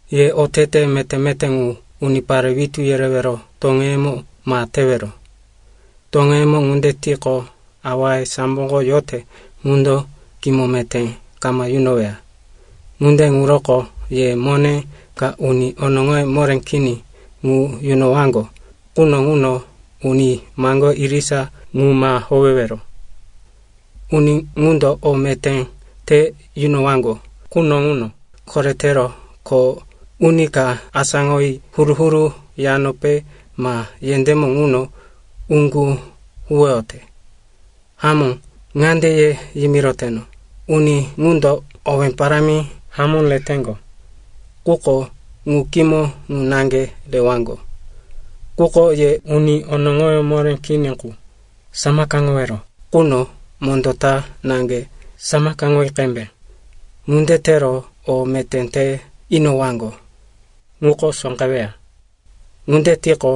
“Ye oteteye meté-meté ŋu unipare witú yerewero toŋeyemo ma tewero. Toŋeyemo ŋunde tiqo, awaye samboko yote ŋundo kimo meté kama yunoweya. “Ŋunde ŋuroko ye mone ka uni onoŋoye moré kini ŋu yunowaŋgo quno ŋuno uni maŋgoye irisa ŋu ma howewero. Uni ŋundo o meté te yunowaŋgo quno ŋuno koretero kho uni ka asáŋoyi huru-huru yanope ma yendémo ŋuno uŋgu huwoyote. Hamó ŋande ye yimiroteno, uni ŋundo owé parámi hamó reteŋgo, quko ŋu kimo ŋu naŋge rewaŋgo. Quko ye uni onoŋoyó moré kini qu samakaŋowero quno mondó ta naŋge samakaŋoyi qembe. Ŋunde tero o meté te inowaŋgo ŋuko sóqeweya. Ŋunde tiqo,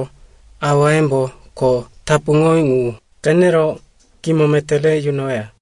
awayembo kho tapuŋowí ŋu qenero kimo meté re yunoweya.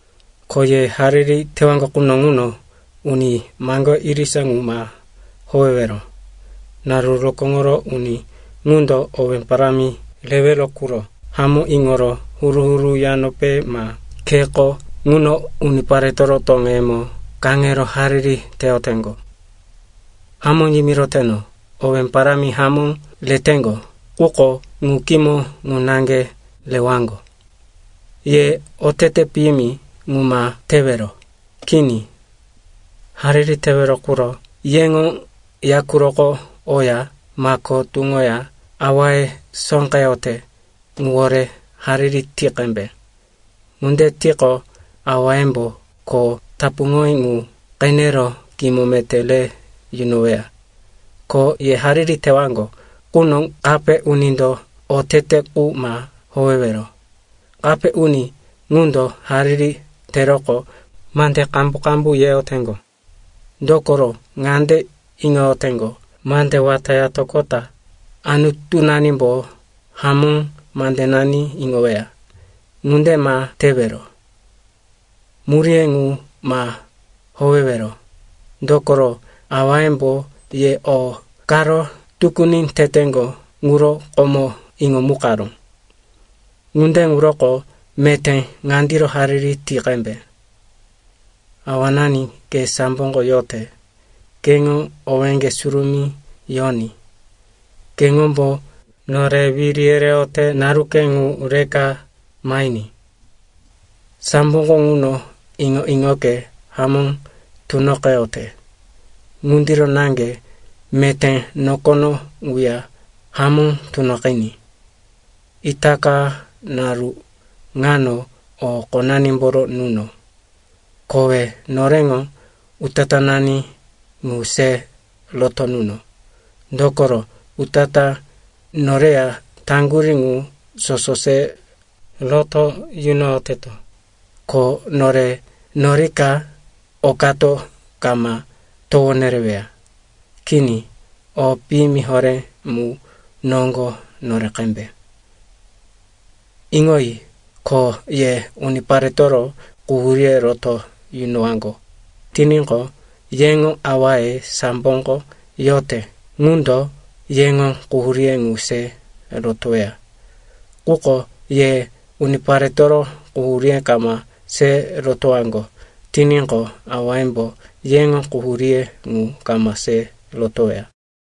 “Ko ye hariri tewaŋgo quno ŋuno uni maŋgoye irisa ŋu ma howewero. Naru rokóŋoro uni ŋundo owé parámi rewero quro hamó iŋoro huru-huru yanope ma kheko ŋuno uniparetoro toŋeyemo kaŋero hariri teyoteŋgo. Hamó yimiroteno, owé parámi hamó reteŋgo, quko ŋu kimo ŋu naŋge rewaŋgo. Ye otete piyimi ŋu ma tewero. Kini, hariri tewero quro yeŋo ya quroko oya, mako tuŋoya, awaye sóqeyote ŋuwore hariri ti qembe. Ŋunde tiqo, awayembo kho tapuŋowí ŋu qenero kimo meté re yunoweya. “Ko ye hariri tewaŋgo quno kape unindo otete qu ma howewero. Kape uni ŋundo hariri teroqo, mande qambu-qambu yeyoteŋgo. Dokoro ŋande iŋoyoteŋgo, mande wata yatoqota anutunanimbo hamó mandenani iŋoweya. Ŋunde ma tewero. Muríye ŋu ma howewero. Dokoro awayembo ye o karo tukuni teteŋgo ŋuro komo iŋomukaró. “Ŋunde ŋuroko meté ŋandiro hariri ti qembe, “‘Awanani, ke samboko yote, keŋo owéŋge surumí yoní, keŋombo nore wiri yereyote naruke ŋu reka mahiní, samboko ŋuno iŋo-iŋoke hamó tunoqeyote, ŋundiro naŋge meté nokono ŋuya hamó tunoqiní. Itaka naru ŋano o qonanimboro nuno. Kowe noreŋo utatánani ŋu se roto nuno, dokoro, utatá noreya taŋgurí ŋu soso se roto yunoyoteto. Ko nore norika okato kama towo nereweya, kini, o piyimi horé mu noŋgo nore qembe.’ Iŋoyi. Ko ye uniparetoro quhuríye roto yunowaŋgo tiníqo, yeŋo awaye samboko yote ŋundo yeŋo quhuríye ŋu se rotoweya. Quko ye uniparetoro quhuríye kama se rotowaŋgo tiníqo, awayembo yeŋo quhuríye ŋu kama se rotoweya.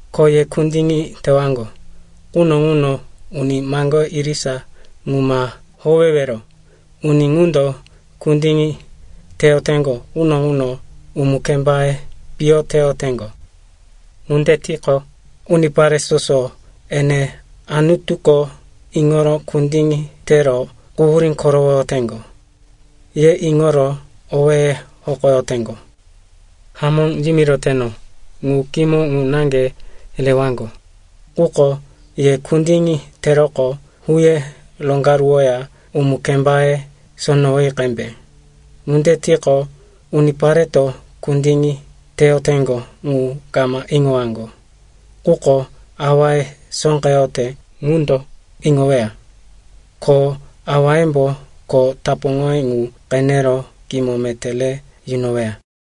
“Ko ye kundiŋi tewaŋgo quno ŋuno uni maŋgoye irisa ŋu ma howewero. Uni ŋundo kundiŋi teyoteŋgo quno ŋuno umu-kembaye piyo teyoteŋgo. Ŋunde tiqo, unipare soso, ene Anutuko iŋoro kundiŋi tero quhurí korowoteŋgo, ye iŋoro owéye hokoyoteŋgo. Hamó yimiroteno, ŋu kimo ŋu naŋge rewaŋgo. Quko ye kundiŋi teroqo, huye roŋgaruwoya umu-kembaye sonowoyi qembe. Ŋunde tiqo, unipareto kundiŋi teyoteŋgo ŋu kama iŋowaŋgo. Quko awaye sóqeyote ŋundo iŋoweya. Ko awayembo kho tapuŋowí ŋu qenero kimo meté re yunoweya.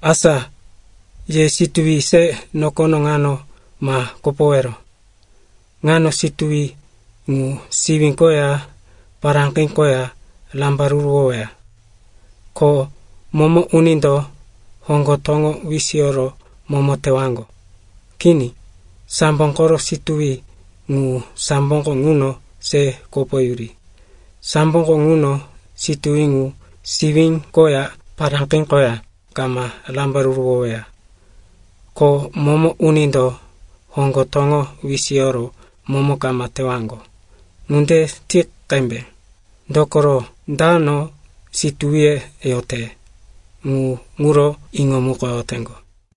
“Asa ye situwi se nokono ŋano ma kopowero. Ŋano situwi ŋu siwí koya paráqi koya rambaruruwoweya. Ko momo unindo hoŋgo toŋo wisiyoro momo tewaŋgo. Kini, sambo koro situwi ŋu samboko ŋuno se kopoyuri. Samboko ŋuno situwi ŋu siwí koya paráqi koya kama rambaruruwoweya. Ko momo unindo hoŋgo toŋo wisiyoro momo kama tewaŋgo. Ŋunde ti qembe, dokoro dano situwiye yote, ŋu ŋuro iŋomukoyoteŋgo.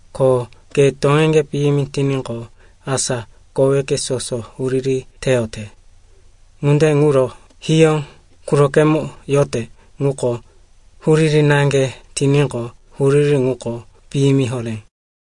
Ko ke toŋeŋge piyimi tiníqo, asa koweke soso huriri teyote. Ŋunde ŋuro hiyó qurokemo yote ŋuko huriri naŋge tiníqo, huriri ŋuko piyimi horé.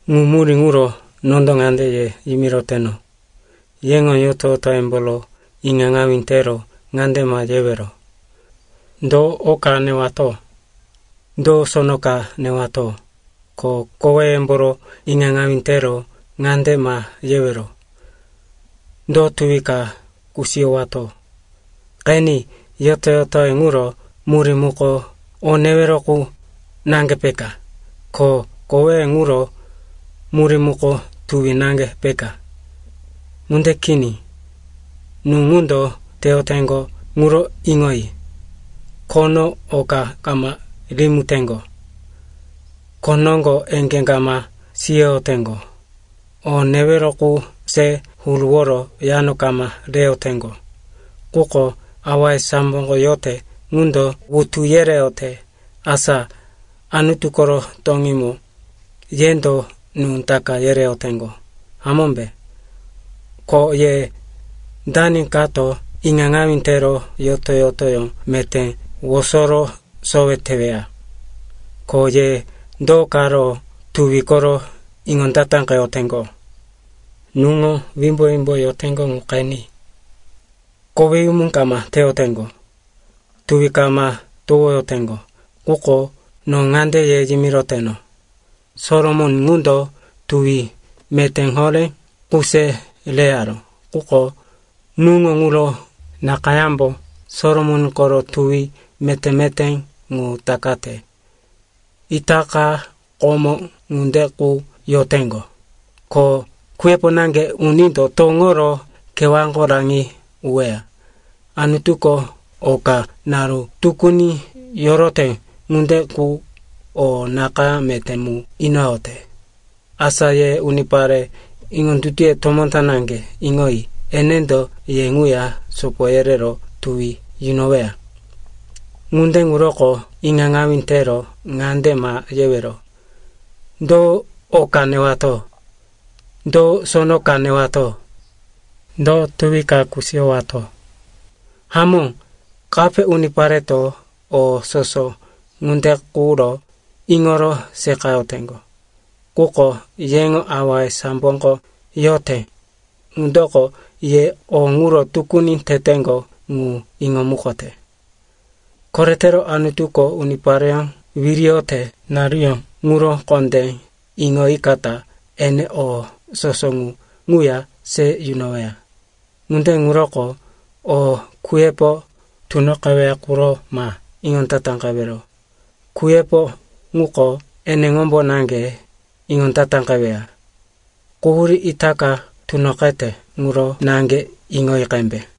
“Ŋu murí ŋuro nondo ŋande ye yimiroteno, yeŋo yoto-yotoyemboro iŋaŋawí tero ŋande ma yewero, ‘Do o ka newato? Do sono ka newato?’ Ko koweyemboro iŋaŋawí tero ŋande ma yewero, ‘Do tuwi ka kusiyowato?’ Qeni, yoto-yotoye ŋuro murí muko o newero qu naŋge, peka? Ko koweye ŋuro murí muko tuwi naŋge, peka? Ŋunde kini. Nú ŋundo teyoteŋgo ŋuro iŋoyi. Khono oka kama rimiteŋgo, kho noŋgo eŋgé kama siyoyoteŋgo, o newero qu se huruworo yano kama reyoteŋgo. Quko awaye samboko yote ŋundo wutu yereyote. Asa Anutu koro toŋímo yendo nú taka yereyoteŋgo, hamómbe? Ko ye dani kato iŋaŋawí tero yoto-yotoyó meté wosoro sowe teweya? “Ko ye do karo tuwi koro iŋondataqeyoteŋgo? Nuŋo wimbo-wimbo yoteŋgo ŋu qeni. Koweyumu kama teyoteŋgo, tuwi kama towoyoteŋgo. Quko no ŋande ye yimiroteno, Solomon ŋundo tuwi meté horé qu se reyaró, quko nuŋo ŋuro nakayámbo Solomon koro tuwi meté-meté ŋu takate. Itaka komó ŋunde qu yoteŋgo, ko kuyepo naŋge unindo toŋoro kewáko raŋi uweya. Anutuko oka naru tukuni yorote ŋunde qu o nakayá meté mu inoyote. Asa ye unipare iŋondutuye tomó ta naŋge, iŋoyi, enendo ye ŋuya sopo yerero tuwi yunoweya. Ŋunde ŋuroko iŋaŋawí tero ŋande ma yewero, ‘Do o ka newato? Do sono ka newato? Do tuwi ka kusiyowato?’ Hamó, kape unipareto o soso ŋunde quro iŋoro seqayoteŋgo. Quko yeŋo awaye samboko yote ŋundoko ye o ŋuro tukuni teteŋgo ŋu iŋomukote. Koretero Anutuko unipareyó wiriyote naruyó ŋuro kondé iŋoyikata ene o soso ŋu ŋuya se yunoweya. Ŋunde ŋuroko o kuyepo tunoqeweya quro ma iŋondataqewero. Kuyepo ŋuko eneŋombo naŋge iŋondataqeweya. Quhurí itaka tunoqete ŋuro naŋge iŋoyi qembe.